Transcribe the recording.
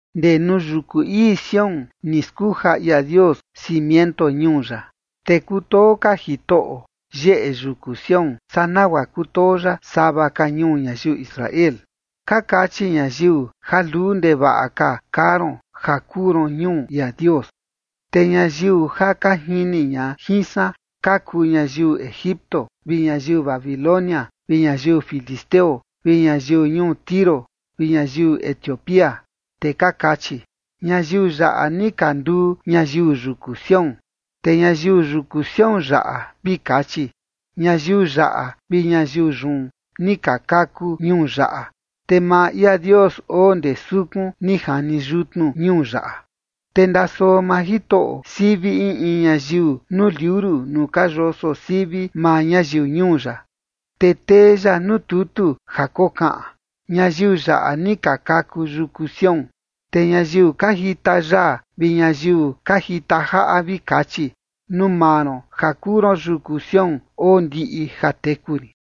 Ndee nuu yuku ii Sión ni skuja ia Dios cimiento ñuu ya. Te kutoo ka Jitoꞌo yeꞌe yuku Sión, saa nagua kutoo ya sava ka ñuu ñayiu Israel. Ka kachi ñayiu ja luu ndevaꞌa ka kaa ron ja kuu ron ñuu ia Dios. Te ñayiu ja ka jini ña jin san ka kuu ñayiu Egipto vi ñayiu Babilonia, vi ñayiu filisteo vi ñayiu ñuu Tiro vi ñayiu Etiopía, te ka kachi: “Ñayiu yaꞌa ni ka nduu ñayiu yuku Sión”. Te ñayiu yuku Sión yaꞌa vi kachi: “Ñayiu yaꞌa vi ñayiu yun ni ka kaku ñuu yaꞌa, te maa ia Dios oo ndee sukun ni jani yutnu ñuu yaꞌa”. Te ndasoo maa Jitoꞌo sivi in in ñayiu nuu liuru nuu ka yoso sivi maa ñayiu ñuu ya, te tee ya nuu tutu ja kokaꞌan: “Ñayiu yaꞌa ni ka kaku yuku Sión”. Te ñayiu ka jita yaa vi ñayiu ka jita jaꞌa, vi kachi: “Nuu maa ron ja kuu ron yuku Sión oo ndiꞌi ja teku rin”.